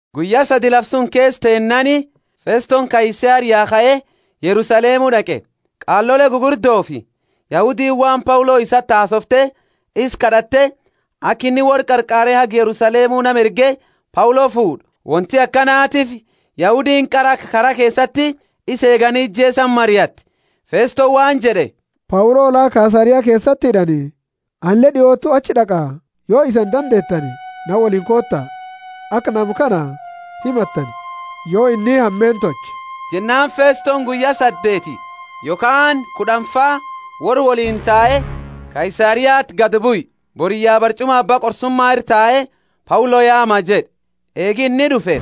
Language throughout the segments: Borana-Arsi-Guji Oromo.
Guyya sadi lafa suni keesa teennaani Festoni Kaisaria kae Yerusalemu d'aqe. Qaalole gugurdofi Yahudiini waan Paulo isati hasoofte, isa kad'atte, aka inni worra qarqaare haga Yerusalemu nama erge Paulo fuud'u. Wonti akanatiifi Yahudiini qara aka kara keesati isa eegani ijeesani mariatte. Festoni waan jed'e, Paulo la Kaisaria keesati hid'ani, anileeni d'iotu achi d'aqa. Yo isani dandeetani, na woliini koota, aka nama kana himattani, yo inni hameenna tolche jed'e. Jennaani Festoni guyya saddeeti yokhaani kud'anfa worra woliini tae Kaisariati gadi bue. Boriyya barch'uma abba qorsuma ira tae Paulo yaama jed'e. Eegi inni d'ufe,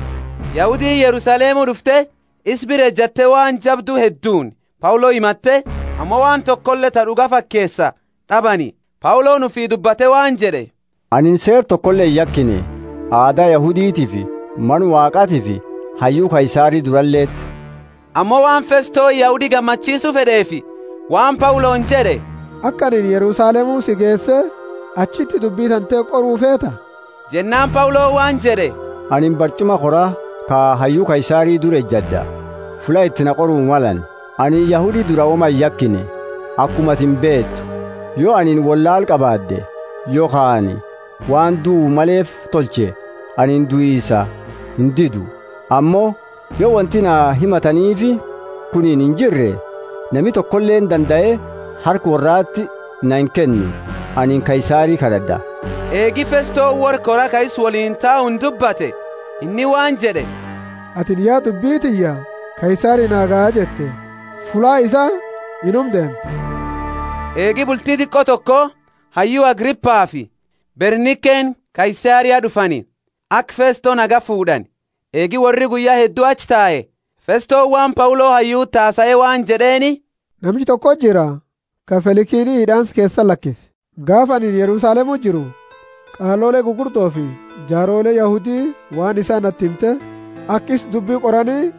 Yahudiini Yerusalemu d'ufte isa bira ejatte waan jabdu hedduuni Paulo himatte, ammo waan tokole ta d'uga fakeesa d'abani. Pauloni ufii dubbate waan jed'e, Anini Seera tokole iyakine aada Yahuditiifi Mana Waaqatiifi hayyu Kaisari duraleti. Ammo waan Festoni Yahudi gammachiisu fed'eefi, waan Pauloni jed'e, aka anini Yerusalemu si geese achiti dubbi tante qoru feeta? Jennaani Pauloni waan jed'e, Anini barch'uma kora ka hayyu Kaisari dura ejad'a, fulla iti na qoru malani. Anini Yahudi dura woma iyakine, akuma atini beetu. Yo anini wollaala qabaad'e yokhaani waan duu maleefi tolche, anini duisa indidu. Ammo yo wonti na himataniifi kunini injirre, nami tokoleeni dandae harka worrati na inkennu. Anini Kaisari kad'ad'a. Eegi Festoni worra kora ka isa woliini tauni dubbate, inni waan jed'e, Atini ya dubbi tiyya Kaisarini naa ga jette, fulla isaa inuma deemta. Eegi bulti diqo toko hayyu Agripafi Bernikeni Kaisaria d'ufani, aka Festo nagaya fuud'ani. Eegi worri guyya heddu achi tae, Festoni waan Paulo hayyuti hasae waan jed'eeni, Namicha tokoti jira, ka Felikini hid'aansa keesati lakise. Gaafa anini Yerusalemu jiru, qaalole gugurdofi jaaroleeni Yahudi waan isaa nati himte aka isa dubbi qorani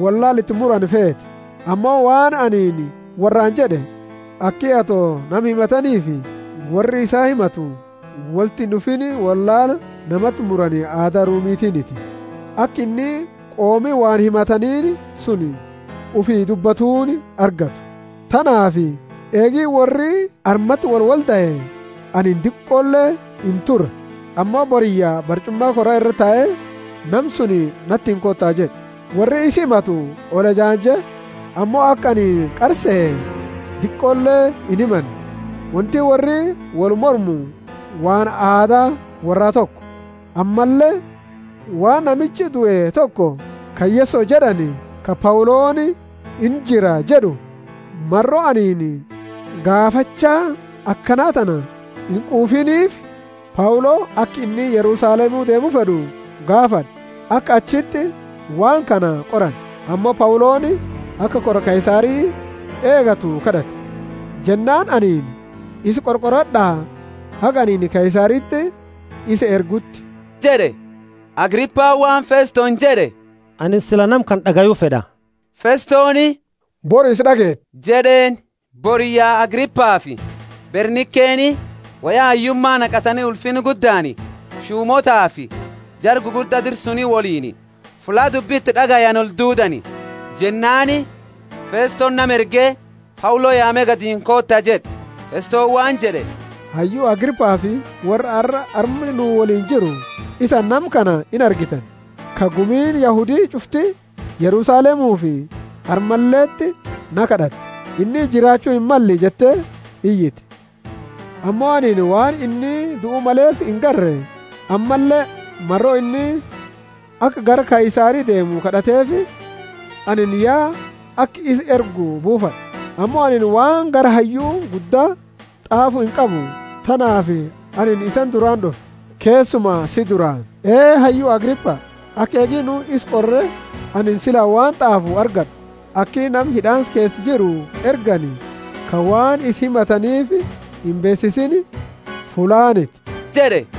wollaala iti murani feete. Ammo waan anini worraani jed'e, aki ato nama himataniifi worra isa himatu wolti ind'ufiini wollaala namati murani aada Rumitini, aka inni qoomni waan himataniini suni ufi dubbatuni argattu. Tanaafi eegi worri armati wolwoldae, anini diqole inture, ammo boriyya barch'uma kora ira tae, Nama suni natiini koota jed'e. Worri isa himatu olejanje, ammo aka anini qara sehe diqole inhimanne. Wonti worri wolmormu waan aada worraa toko, ammalle waan namicha due toko, ka Yeso jed'ani, ka Pauloni, Injira jed'u. Maro anini gaafacha akana tana inquufiniifi, Paulo aka inni Yerusalemu deemu fed'u gaafad'e, aka achiti waan kana qorani. Ammo Pauloni aka kora Kaisari eegatu kad'ate. Jennaani anini, Isa qorqorad'a, haga anini Kaisariti isa erguuti jed'e. Agripani waan Festoni jed'e, Anini sila nama kana d'agayu fed'a. Festoni, Bori isa d'ageeta jed'eeni. Boriyya Agripafi Bernikeni woya hayyuma naqatani ulfinna guddaani shumootaafi jara gugurda dira suni woliini fulla dubbi iti d'agayani olduudani. Jennaani Festoni nama erge Paulo yaame gadini koota jed'e. Festoni waan jed'e, Hayyu Agripafi worra arra arma nu woliini jirru: isani nama kana inargitani, ka gumiini Yahudi ch'ufti Yerusalemufi armaleti na kad'atte, Inni jiraachu himmalle jette iyite. Ammo anini waan inni duu maleefi inargine, ammalle maro inni aka gara Kaisari deemu kad'ateefi, anini ya aka isa ergu buufad'e. Ammo anini waan gara hayyu gudda t'aafu inqabu; tanaafi anini isani duraani d'ufe, keesuma si duraani, Ee hayyu Agripa, aka eegi nu isa qorre, anini sila waan t'aafu argad'u. Aki nama hid'aansa keesa jiru ergani, ka waan isa himataniifi imbeesisiini, fullaaniti jed'e.